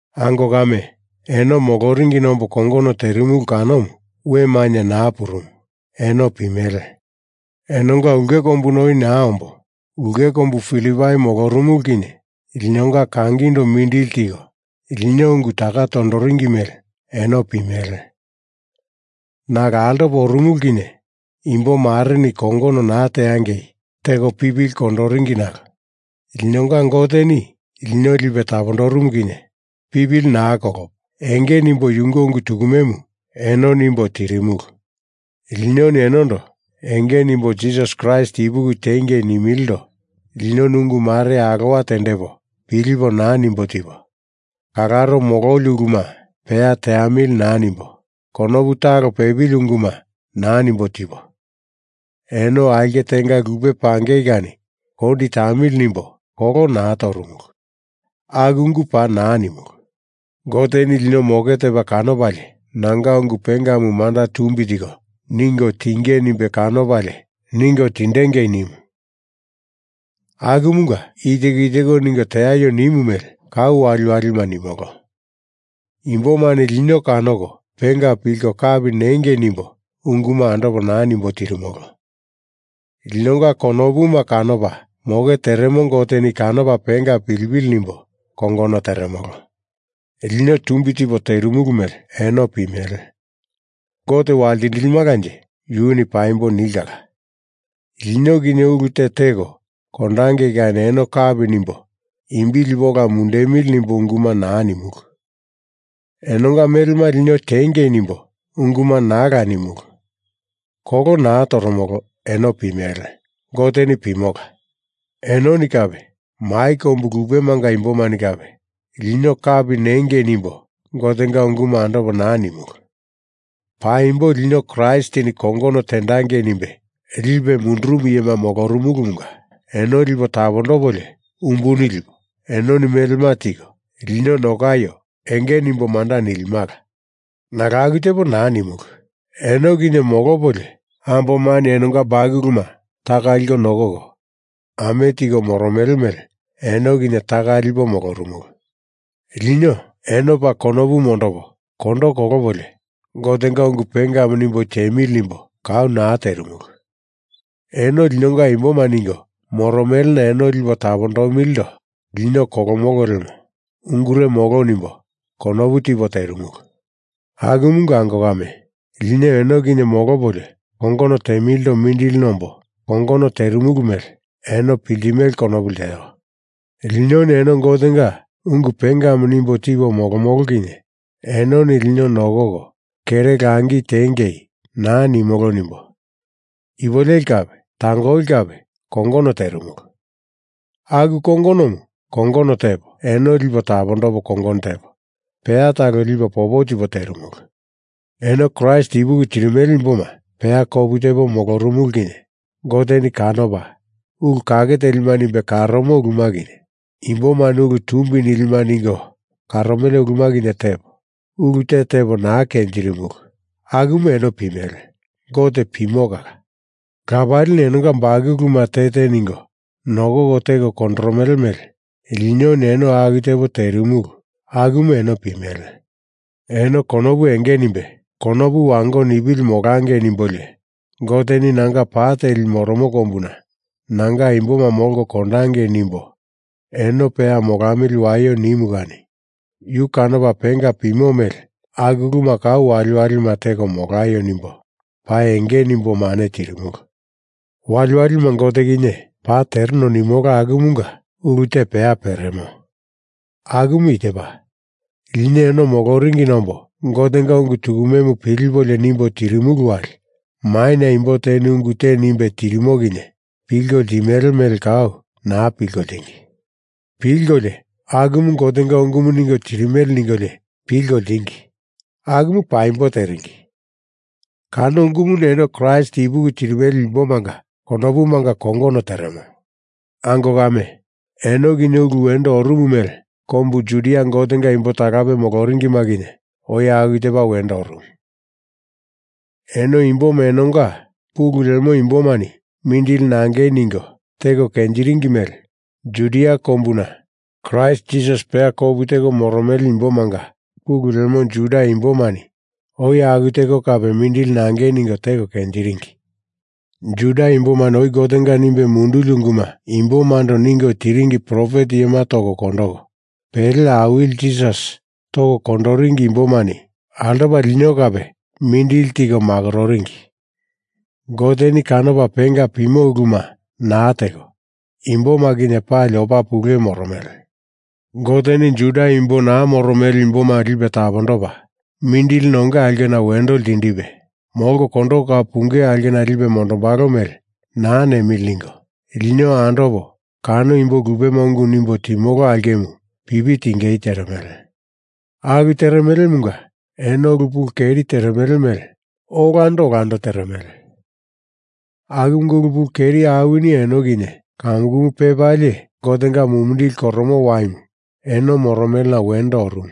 Ango kame, eno moloringina ombo kongono terimulu kanomu we mainye naa purumu eno pimele. Enonga ulke kombuna oi naa ombo ulke kombu Filipai molorumulu kinye linonga kangindo mindili tiko lino ungu taka tondoringi mele eno pimele. Nalo altopa orumulu kinye imbomareni kongono naa teangei teko pipili kondoringi nalo linonga Goteni lino lipe tapondorumu kinye pipili naa kolopo enge nimbo yunge ungu tukumemu eno nimbo tirimulu. Linoni enondo enge nimbo Jisas Kraist ipuki tiengei nimilindo linoni ungu mare alowa tendepo pilipo naa nimbo tipo, kalaro mololi uluma peya teamili naa nimbo konopu talo pepili unguma naa nimbo tipo, eno aulke tenga lupe pangei kani kondi tamili nimbo kolo naa torumulu. Aku ungu paa naa nimulu. Goteni lino moke tepa kanopalie nanga ungu pengamu manda tumbi tiko ningo tinge nimbe kanopalie ningo tindengei nimu, akumunga i teko i teko ningo tieio nimu mele kau waliwalima nimolo. Imbomani lino kanoko penga pilko kapi nengei nimbo unguma andopo naa nimbo tirimolo. Linonga konopuma kanopa moke teremo Goteni kanopa penga pilipili nimbo kongono teremolo. Lino tumbi tipo terimulu mele eno pimele. Gote waltindilimalanje yuni paimbo nilkala. Lino kinye ulu te teko kondangei kani eno kapi nimbo imbi lipo ola mundundemili nimbo unguma naa nimulu. Enonga melema lino tiengei nimbo unguma naala nimulu. Kolo naa toromolo eno pimele, Goteni pimola. Enoni kape mai kombu lupemanga imbomani kape lino kapi nengei nimbo Gotenga ungumu andopo naa nimulu. Paimbo lino Kraistini kongono tendangei nimbe lipe mundurumu iyema molorumulumunga eno lipo tapondopolio umbuni lipo enoni melema tiko lino nokaio enge nimbo manda nilimala. Nalo aku tepo naa nimulu. Eno kinye molopolio ambomani enonga bakuluma taka liko nokoko ame tiko moromele mele eno kinye taka lipo molorumulu. Lino eno paa konopu mondopo kondo kolopolio Gotenga ungu pengamu nimbo tiemili nimbo kau naa terimulu. Eno linonga imboma ningo moromelena eno lipo tapondomilindo lino kolomolo lemo ungure molo nimbo konopu tipo terimulu. Akumunga ango kame, lino eno kinye molopolio kongono temilindo mindili nombo kongono terimulu mele eno piltimele konopu lteo. Linoni eno Gotenga ungu pengamu nimbo tipo molomolo kinye enoni lino nokoko kere langi tiengei naa nimolo nimbo ipu leli kape tangoli kape kongono terimulu. Aku kongonomu kongono tepo, eno lipo tapondopo kongono tepo, peya talo lipo popo tipo terimulu. Eno Kraist ipuki tirimele imboma peya kopu tepo molorumulu kinye Goteni kanopa ulu kake telima nimbe karomo uluma kinye, imbomani ulu tumbi nilima ningo karomele uluma kinye tepo, ulu te tepo naa kenjirimulu akumu eno pimele, Gote pimo kala. Lapalini enonga bakuluma te te ningo nokoko teko kondoromele mele linoni eno aku tepo terimulu akumu eno pimele. Eno konopu enge nimbe konopu wango nipili molangei nimbolio, Goteni nanga pa teli moro kombuna nanga imboma molko kondangei nimbo eno peya molamili waio nimu kani yu kanopa penga pimo mele aku uluma kau waliwalima teko molaio nimbo paa enge nimbo mane tirimulu. Waliwalima Gote kinye paa tereno nimolo akumunga ulu te peya peremo. Akumu i tepa: Lino eno moloringina ombo Gotenga ungu tukumemu pilipolio nimbo tirimulu wali maina imbo teni ungu te nimbe tirimo kinye pilko ltimele mele kau naa pilko ltingi. Pilkolio akumu Gotenga ungumu ningo tirimele ningolio pilko ltingi. Akumu paimbo teringi. Kano ungumuni eno Kraist ipuki tirimele imbomanga konopumanga kongono teremo. Ango kame, eno kinye ulu wendo orumu mele kombu Judia Gotenga imbo talape moloringima kinye oi aku tepa wendo orumu. Eno imboma enonga pulu lemo imbomani mindili nangei ningo teko kenjiringi mele, Judia kombuna Kraist Jisas peya kopu teko moromele imbomanga pulu lemo Juda imbomani oi aku teko kape mindili nangei ningo teko kenjiringi. Juda imbomani oi Gotenga nimbe munduli unguma imbomando ningo tiringi profet iyema toko kondoko, pele Awili Jisas toko kondoringi imbomani altopa lino kape mindili tiko makororingi. Goteni kanopa penga pimo uluma naa teko, imboma kinye pali opa pule moromele. Goteni Juda imbo naa moromele imboma lipe tapondopa, mindili nonge aulkena wendo ltindipe, molko kondoko kau punge aulkena lipe mondombalo mele naa nemili ningo, lino andopo kano imbo lupema ungu nimbo timolo aulkemu pipi tingei teremele. Aku teremelemunga eno ulu pulu keri teremele mele olando olando teremele, akumunga ulu pulu keri awini eno kinye kamukumu pepalie Gotenga mumindili koromo waimu eno moromelena wendo orumu.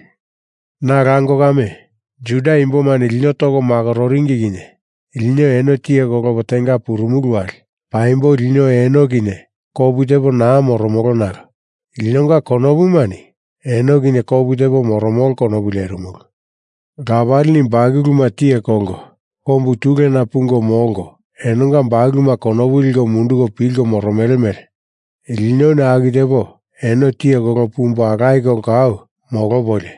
Nalo ango kame, Juda imbomani lino toko makororingi kinye lino eno tiye kolopo tenga purumulu wali paimbo lino eno kinye kopu tepo naa moromolo nalo linonga konopumani eno kinye kopu tepo moromolo konopu lerimulu. Lapalini bakuluma tiye kolko kombu tulena pungo molko enonga bakuluma konopu liko munduko pilko moromele mele linoni aku tepo eno tiye kolopo pumbo alaye kolo kau molopolio,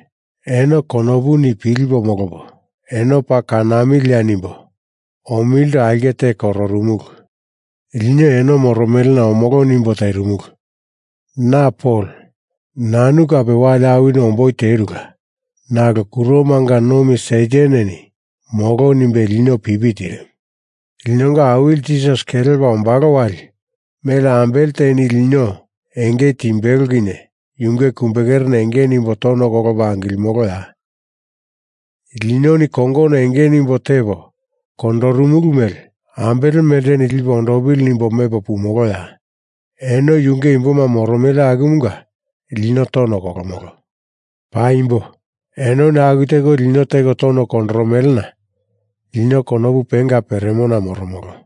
eno konopuni pilipo molopo eno paa kanamilia nimbo omilindo aulke te kororumulu. Lino eno moromelena omolo nimbo terimulu. Na Pol nanu kape wali awini omboi terula, nalo kuromanga nomi Sataneni molo nimbe lino pipi tirimu. Linonga Awili Jisas kelepa ombalo wali mele ambele teni lino enge timbelo kinye yunge kumbekerena enge nimbo tono kolopo angilimoloya? Linoni kongono enge nimbo tepo kondorumulu mele ambele melteni lipe ondopili nimbo mepo pumoloya? Eno yunge imboma moromele akumunga lino tono kolomolo. Paimbo, enoni aku teko lino teko tono kondoromelena lino konopu penga peremona moromolo.